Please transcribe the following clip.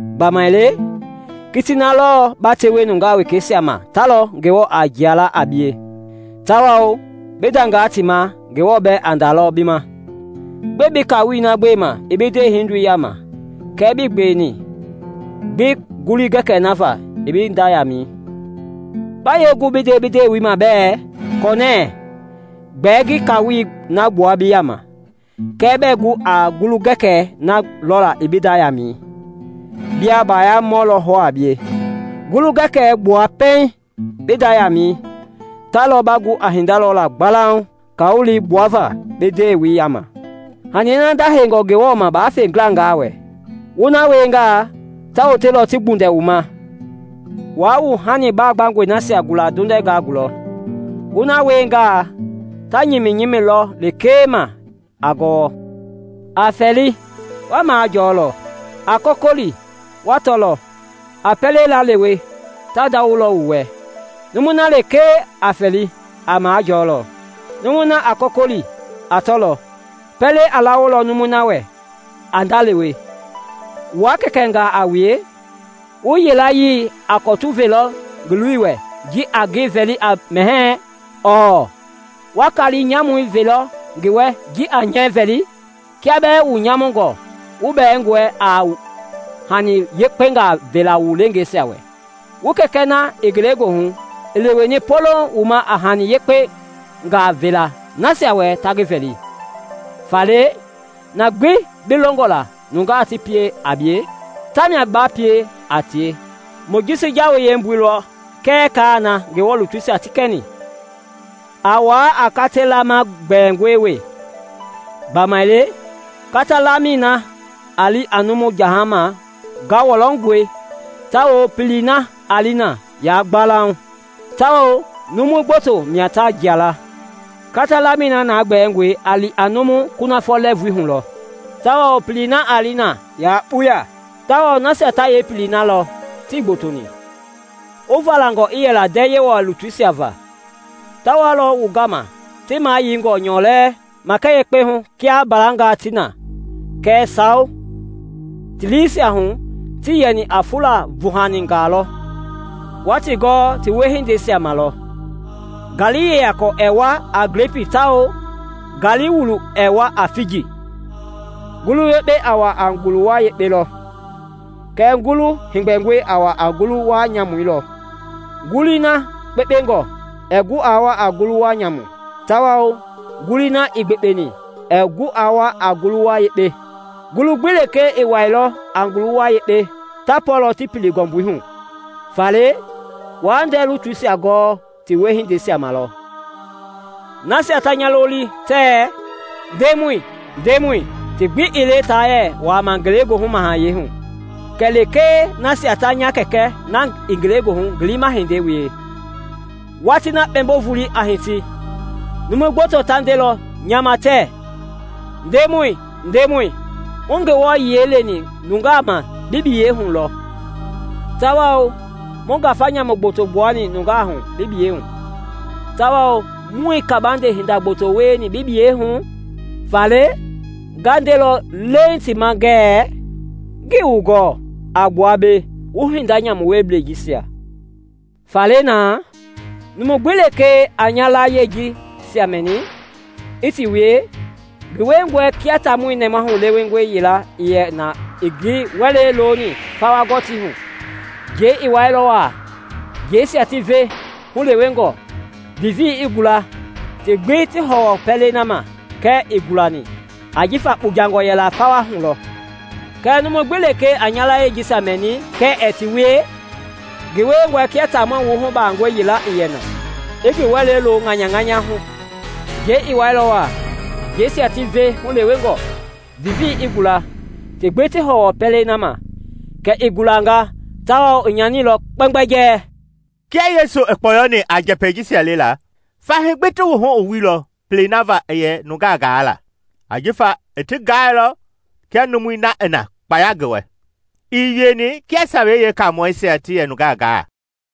Gbamaile kitii na lɔɔ ba tewe nungaa wekeisia ma ta lɔ Ngewɔ a jia la a bie, tawao bi dangaa ti ma Ngewɔ bɛɛ a dalɔ bi ma. Gbɛe bi kaawolei na gbema i bi ndewehindoi yama kɛɛ bi gbewe gbi ngulu-gɛkɛɛ na va i bi nda yaamɛi? Ba yee gu bi nde bi ndewei ma bɛɛ, ‘Kɔnɛɛ, gbɛɛ ngi kaawolei na gbua bi yama,’ kɛɛ bɛɛ gu a ngulu-gɛkɛɛ na lɔlaa i bi nda yaamɛi? Bia baayamɔ lɔ hɔɔ a bie! Ngulu-gɛkɛɛ gbua pɛiŋ bi nda yaamɛi, ta lɔ ba gu a hinda lɔla gbalauŋ kaawolei gbuava bi ndewei yama. “Hani na ndaheingɔ Ngewɔ ma waa fe ngilangaa wɛ. Wu na wiengaa, ta wotelɔ ti gbundɛ wu ma. Waa wu hani baagbangɔi nasia gula ndondɛngaa gulɔ, wu na wiengaa, ta nyiminyimilɔ lekee ma a gɔwɔ. “A fɛli, wa majɔlɔ; a kɔkɔli wa tɔlɔ; a pɛlei laalewe, ta ndawolɔ wu wɛ. Numui na lekee a fɛli, a majɔlɔ, numui na a kɔkɔli, a tɔlɔ, pɛlei a lawolɔ numui na wɛ a ndalewe. Wua kɛkɛngaa a wue, wu yilayee a kɔtu velɔ ngi loi wɛ ji a ngi vɛli a mɛhɛɛ? Ɔɔ, wa kaali nyamu velɔ ngi wɛ ji a nyɛɛ vɛli? Kia bɛɛ wu nyamungɔ wu bɛɛngɔe a hani yekpengaa vela wu leengeisia wɛ. Wu Kɛkɛ na i Ngelegoohu i leweni poloŋ wu ma a hani yekpengaa vela nasia wɛ ta ngi vɛli! “Faale na gbi bi longɔ nungaa ti pie a bie, tamia ba pie a tie; Mojisi jawei yeembui lɔ kɛɛ kaai na Ngewɔ lutuisia ti kɛni. “A wuaa a kata laama gbɛɛngɔi wee, gbamaile katei lamɛi na a li a numu jahama ngawɔlɔngɔe tawao pelei a li na ya gbalauŋ, tawao numu gboto mia ta jia la. Kata lamɛi na gbɛɛngɔe a li a numu kunafɔ lɛɛvui hu tawao pelei na a li na ya kpuya tawao nasia ta yeepelei na lɔ tii gbotoni. “Wu valangɔ i yɛla ndɛɛ Yewɔ lutuisia va; ta walɔ wu gama ti mayeingɔ nyɔlɛɛ makɛ yekpe hu kia mbalangaa ti na, kɛɛ sawo, ti liisia hu, ti yɛni a fula vuhaingaa lɔ. Wa ti gɔɔ ti wiehindei ma lɔ. Ngaali yeyakɔ ɛɛ wua a glepii tawao ngaali wulu ɛɛ wua a figi. Ngulu yekpei a wua a nguluwa yekpei lɔ, kɛɛ ngulu heegbɛngɔi a wa a ngulu-wa nyamui lɔ. Ngulii na kpenkpengɔ ɛɛ gu a wua a ngulu-wa nyamu, tawao ngulii na ii gbekpeni ɛɛ gu aa wua a ngulu-wa yekpe. Ngulu gbi lekee ii wɛilɔ a ngulu-wa yekpe ta pɔlɔ ti pili ngɔmbui hu. Faale, wa ndɛɛ lutuisia gɔɔ ti wiehindeisia ma lɔ. “Nasia ta nya loli tɛɛ ‘Ndemɔi, Ndemɔi,’ ti gbi ii le ta yɛ wuaama Ngelegoohu Mahayɛi hu, kɛlee nasia ta nya Kɛkɛ na i Ngelegoohu ngi liima hindei wie. Watii na kpɛmbo-volei a hiti, numu gboto ta ndelɔ nya ma tɛɛ, ‘Ndemɔi, Ndemɔi, muii Ngewɔ yiɛi leni nungaa ma bi biyei hu, tawao bi gbayei hu muii ngafa nyamu gboto gbuani nungaa hu, tawao muii kabande hinda gboto wieni bi biyei hu?’ Faale nga ndelɔ leeŋ ti ma ngɛɛ, ‘Ngii wu gɔɔ; a gbua mbei, wu hinda nyamu wieblɛi jisia.’ “Faale na, numu gbi lekee a nya layie jisia mɛni, i ti wie, ngi wiengɔe kia taamɔ nɛmahu lewengɔ yila i yɛ na i ngi wɛlei loni fawa gɔtii hu. Njɛi i wɛilɔ wa, njɛisia ti ve hulewengɔ, vivii i gula, ti gbi ti hɔwɔ pɛlei na ma kɛɛ ii gulani, ajifa kpujangɔ yɛla fawei hu lɔ. “Kɛɛ numu gbi lekee a nya layie jisia mɛni kɛɛ ɛɛ ti wie, ngi wiengɔe kia taamɔ wuhubangɔ yila i yɛ na, i ngi wɛlei lo ŋanyaŋanyɛi hu. Njɛi i wɛilɔ wa, njɛisia ti ve hulewengɔ, vivii i gula, ti gbi ti hɔwɔ pɛlei na ma kɛ i gulanga; tawao i nyanilɔ kpɛmgbɛjɛɛ!” Kia Yesu i kpɔyɔni a njɛpɛi jisia lela, fahii gbi ti wuhu i wuilɔ pelei na va i yɛ nungaa gaa la. Ajifa i ti gaailɔ kia numui na i na kpaya ngi wɛ, ii wieni kia Sawei Yeekamɔɛisia ti yɛ nungaa gaa.